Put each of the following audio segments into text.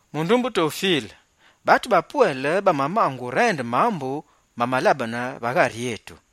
Mundumbe Tofile, batu bapwele bamamaange urende mambu amamalabene va ghari etu.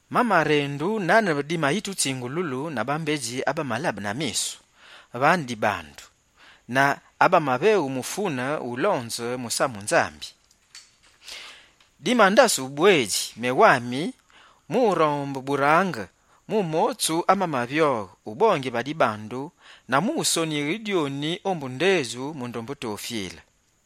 Bamarende nane dimatutsingululu na bambedji abamalabe na misu, vane dibandu, na abamaveghu mufune ulonze musamu Nzambi. Nyimalabe yi diwelimine mewami, mu rombe burange mu motsu amamavyoghe ubongile va dibandu, mu wusonighile dyoni, mundumbe Tofile.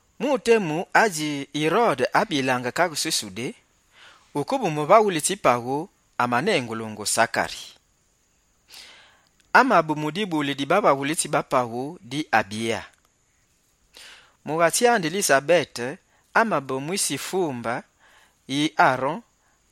Mu temu adji Yirode amabilaange kaghe dji Sudé, wukebe muvaghulitsi paghu amanengulungu Sakari. Amabe mu dibuli di bavaghulitsi ba paghu di Abya. Mughatsi andi Lisabete, amabe mu kule dji Arone.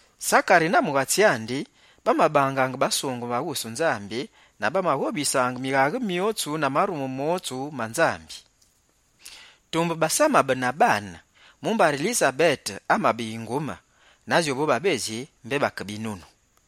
Sakari na mughatsi andi, bamabangaange basungeme va wusu Nzambi na bamaghobisaange mighaghe myotsu na marume motsu ma Fumu. Tumbe basamabe na baane mumbari Lisabete amabe yingume, na djowubotsu babedji mbé bake binunu.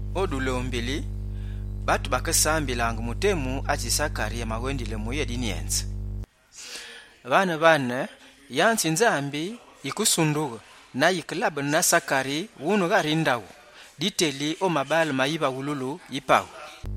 O dulombili, yinombu yi batu yikesambilaange mu temu adji Sakari amawendile mu uyébinyenze. Vane-vane, yanze yi Fumu yikesundughe na yikelabene na Sakari wune ghari ndaghu, diteli o mabaale ma yivaghululu yi paghu.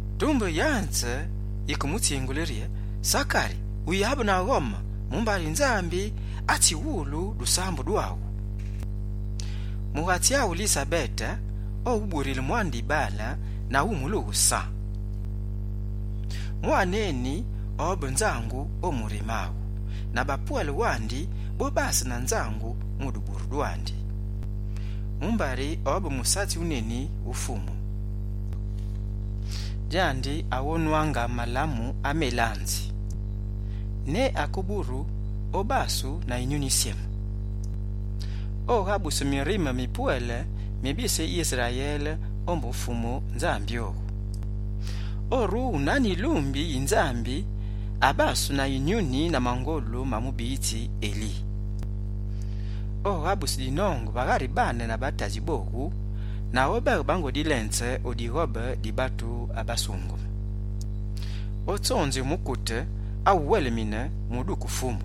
Tumbe yanze yikemutsingule rye: «Sakari uyabe na ghome, mumbari Nzambi amawulu dusambu dwaghu. Mughatsi aghu Lisabete owuburile mwane dibaale, na wumulughe San. Mwane eni obe nzangu o murime aghu na bapwele wandi bobase na nzangu mu duburu dwandi. Mumbari obe musatsi wuneni wu Fumu. Djandi, aghonwaangange malamu amelanzi. Ne akeburu, obasu na Yinyuni Yisyeme. Oghabuse mirime mipwele mi bise Yisrayele ombu Fumu Nzambi owu. Orughe nane yilumbi yi Nzambi abasu na Yinyuni na mangolu ma Eli mubiyitsi Nzambi. Oghabuse dinonge va ghari baane na batadji bowu na obeghe bango dilenze o dighobe di batu abasungeme. Otsonzighe mukute awube uwelimine mu uduke Fumu.»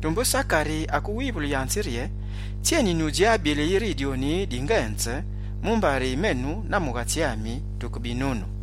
Tumbe Sakari akewivule yanze rye: «Tsyeni nyudjabile yiri dyoni dingenze? Mumbari menu na mughatsi ami tuke binunu.»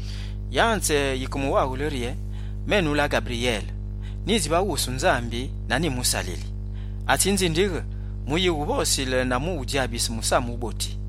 Yanze yike muwaghule rye: «Menu, la Ghabiryele, nyidji va wusu Nzambi na nyimusalili, atsinzindighe mu uyighuvosile na mu udjabise musamu wuboti.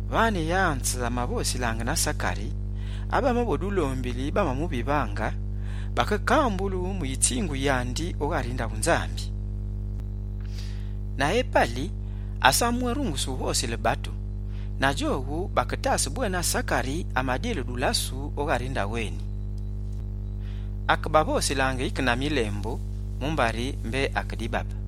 Vane yanze amavosilaange nandi, abamabe o dulombili bamavivaange Sakari, bakekambulu mu yitsingu yandi o ghari ndaghu Nzambi. Na epali, asamabwérunguse wuvosile batu, na djowu baketase bwena Sakari amadile dulasu o ghari ndaghu eni. Akebavosilaange yike na milembu mumbari mbé ake dibabe.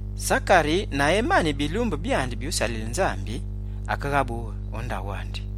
Sakari na emani bilumbu byandi byusalile Nzambi, akeghabughe o ndaghu andi.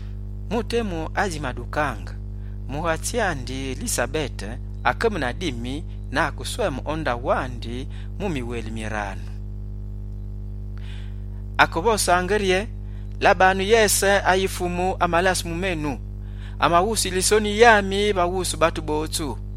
Mu temu adjimadukaange, mughatsi andi Lisabete akabe na dimi na akesweme o ndaghu andi mu miweli miranu. Akevosaange rye: «Labanu yese ayi Fumu amalase mu menu, amaghusule yisoni yami va wusu batu botsu.»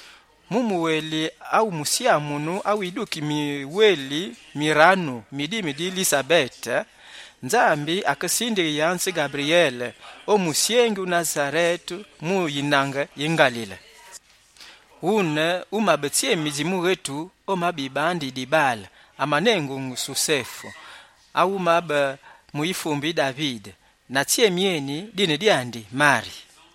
Mu muweli awu musyamunu wu dimi di Lisabete, Nzambi akesindighe yanze Ghabiryele o musyengi Nasarete mu yinange yi Ngalile. Wune, wumabe tsyemi dji mughetu omabe yibande yi dibaale dimanengulungu Sosefe, awu amabe mu yifumbe yi Davide. Na tsyemi eni, dine dyandi Mari.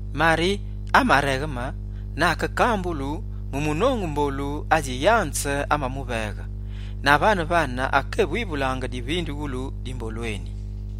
Mari amaregheme na akekambulu mu munongu mbolu adji yanze amamuveghe, na vane-vane, akekéwivulaange divindughulu di mbolu eni.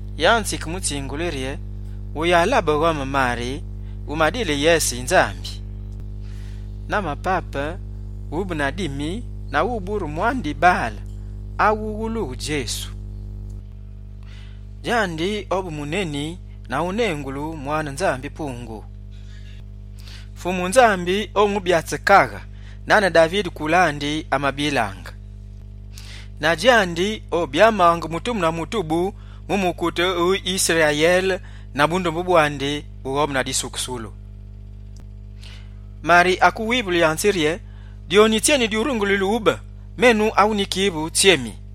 Yanze yikemutsingule rye: «Wuyalabe ghome Mari, wumadile yese yi Nzambi. Na mapape, wube na dimi na wubure mwane dibaale awulughe Djesu. Djandi obe muneni na onengulu Mwane Nzambi-Pungu. Fumu Nzambi omubyatse kaghe nane Davide kule andi abilaange. Na djandi obyamaange mutubu na mutubu mu mukute Sakobe, na bukaghe bwandi bughobe tena disukusulu.» Mari akewivule yanze rye: «Dyoni tsyeni dyurungulile ubile, menu awu nyikivu tsyemi?»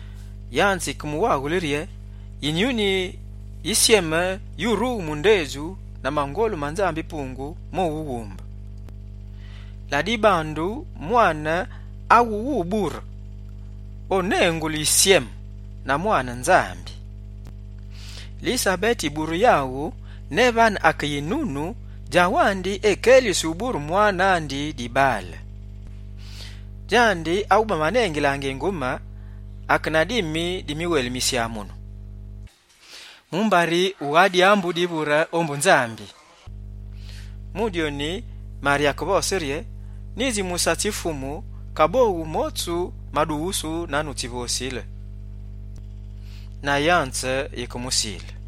Yanze yike muwaghule rye: «Yinyuni Yisyeme yurughe mu ndedju na mangolu ma Nzambi-Pungu mowughumbe. Ladibandu mwane awubure wube wusyeme, onengulu Mwane Nzambi. Lisabete yiburu yaghu ne nane ake yinunu, djawandi ekelisi ubure mwane andi dibaale. Djandi awu bamanengilaange yingume ake na dimi di miweli misyamunu. Mumbari vagha dyambu divure ombu Nzambi.» Mu dyoni, Mari akevose rye: «Nyidji musatsi Fumu, kaboghu motsu madughusu nane wutsivosile.» Na yanze yikemusile.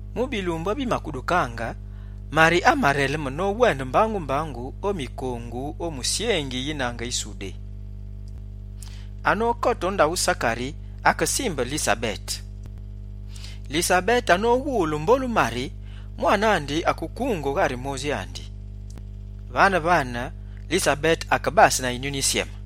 Mu bilumbu abimadukaange, Mari amareleme nowende mbangu-mbangu o mikongu o musyengi yinange yi Sudé. Anokote o ndaghu Sakari, akesimbe Lisabete. Lisabete anowulu mbolu Mari, mwane andi akekunge o ghari modji andi. Vane-vane, Lisabete akebase na Yinyuni Yisyeme.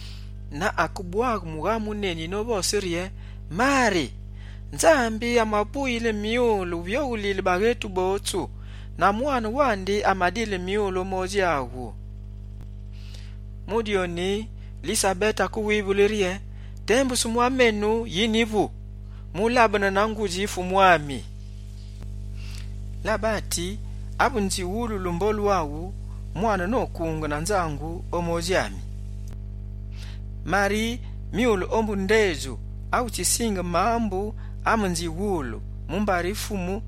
Na akebwaghe mughamu wuneni novose rye: «Mari, Nzambi amawupuyile myule wuvyoghulile baghetu botsu na mwane wandi amadile myule o modji aghu!» Mu dyoni, Lisabete akewivule rye: «Tembusu menu yi nyivu, mulabene na ngudji Fumu ami? Labati, ave nyiwululu mbolu aghu, mwane nosangughe na nzangu o modji ami. Mari, myule ombu ndedju awutsisinge mambu amanziwulu mumbari Fumu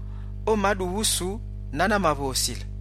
omadughusu nane amavosile.»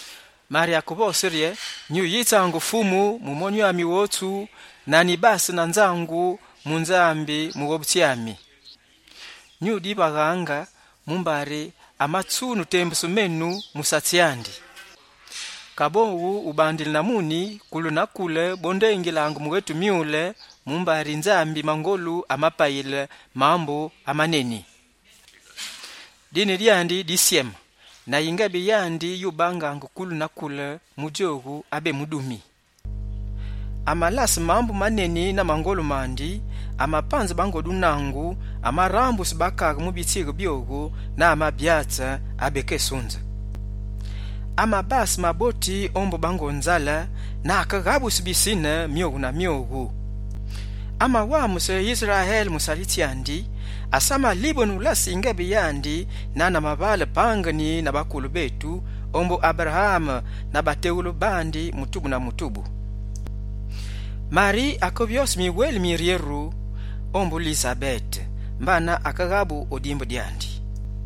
Mari akevose rye: «Nyuyitsaange Fumu, mu monyu ami wotsu, na nyibase na nzangu mu Nzambi, Mughobutsi ami. Nyudivaghanga, mumbari amatsune tembusu menu musatsi andi. Kaboghu, ubandile na muni, kule na kule bondengilaange mughetu myule, mumbari Nzambi Mangolu amapayile mambu amaneni. Dine dyandi disyeme, na yingebe yandi yubangage kule na kule mu djowu abemudumi. Amalase mambu maneni na mangolu mandi, amapanze bango dunangu, amarambuse bakaghe mu bitsighe byowu, na amabyatse abakesunze. Amabase maboti ombu bango nzale, na akeghabuse bisine myowu na myowu. Amawamuse Yisrayele, musalitsi andi, asamalibene ulase yingebe yandi, nane amavangenine na bakule betu, ombu Aberaame na bateghule bandi mutubu na mutubu.» Mari akevyose miweli miryeru ombu Lisabete, mbana akeghabughe o dimbu dyandi.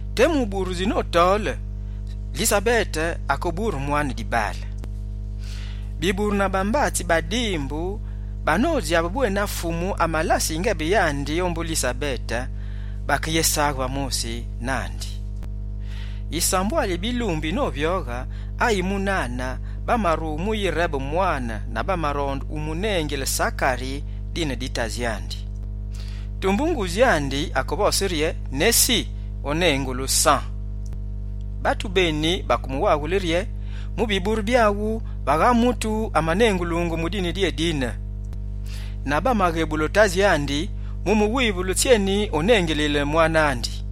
Temu ubure djinotole, Lisabete akebure mwane dibaale. Biburu na bambatsi ba dimbu na bédjabi bwena Fumu amalase yingebe yandi ombu Lisabete, bakeyésaghe va mosi nandi. Yisambwali yi bilumbu yinovyoghe, ayi munane, bamarughe mu yirebe mwane na bamaronde umunengile Sakari nane tadji andi. Tumbe ngudji andi akevose rye: «Nesi, onengulu San.» Batu beni bakemuwaghule rye: «Mu biburu byaghu, vagha mutu amanengulungu mu dine dyeni dine.» Na bamaghebule tadji andi mu muwivule tsyeni onengilile mwane andi.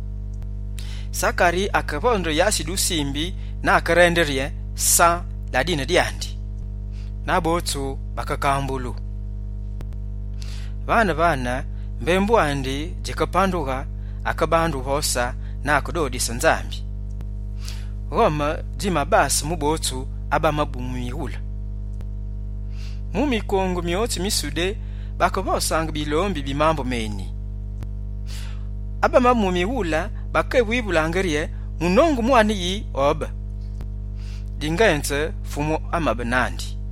Sakari akevonde yasi yi dusimbi na akerende rye: «San la dine dyandi.» Na botsu bamakambulu. Vane-vane, mbembu andi djikepandughe, akebande wuvose na akedodise Nzambi. Ghome djimabase mu botsu abamabe mu mighule. Mu mikongu myotsu mi Sudé, bakevosaange bilombi bi mambu meni. Botsu abamadiwulu, bakedikelulaange: «Munongu mwane yi obe?» Dingenze, Fumu amabe nandi.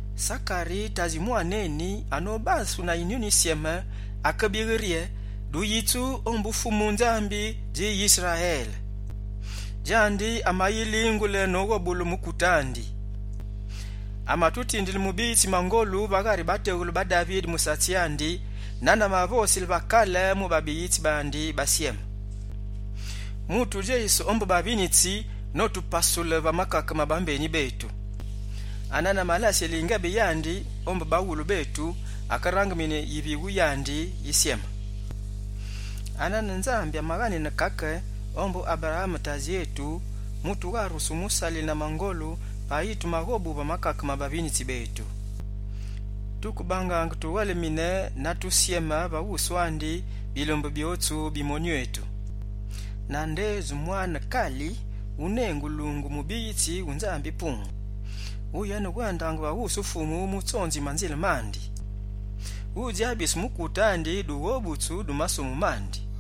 Sakari, tadji mwane eni, anobe abasu na Yinyuni Yisyeme, akebighe rye: «Duyitsu ombu Fumu Nzambi dji Yisrayele. Djandi, amayilingule noghobule mukute andi. Amatutindile Mughobutsi mangolu va ghari bateghule ba Davide, musalitsi andi, nane amavosile va kale mu babiyitsi bandi basyeme. Mutudjeyise ombu bavinitsi, notukawule va makake ma bambeni betu. Anane amalasile yingebe yandi ombu baghulu betu, akerangimine yivighu yandi yisyeme. Anane Nzambi amaghanine kaka ombu Aberaame tadji etu, mu tugharusu wumusalile na mangolu, payi tumaghobughe va makake ma bavinitsi betu. Tukebangaange tuwelimine na tusyeme va wusu andi, bilumbu byotsu bi monyu etu. Na ndedju mwane kali, unengulungu “Mubiyitsi wu Nzambi-Pungu”, mumbari, uyenewendaange va wusu Fumu mu tsonzighe manzile mandi, udjabise mukute andi dughobutsu dwandi na dutandu du mabi mandi.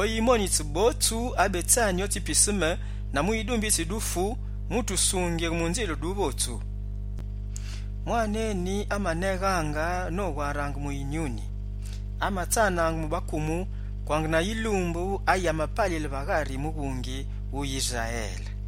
Oyimonitse botsu abetsani otsi piseme na mu yidumbitsi yi dufu, mu tusungighe mu nzile duvotsu.» Mwane eni amaneghaange nowarange mu Yinyuni. Amatsanaange mu bakumu, kwange na yilumbu ayi amapalile va ghari mughungi wu Yisrayele.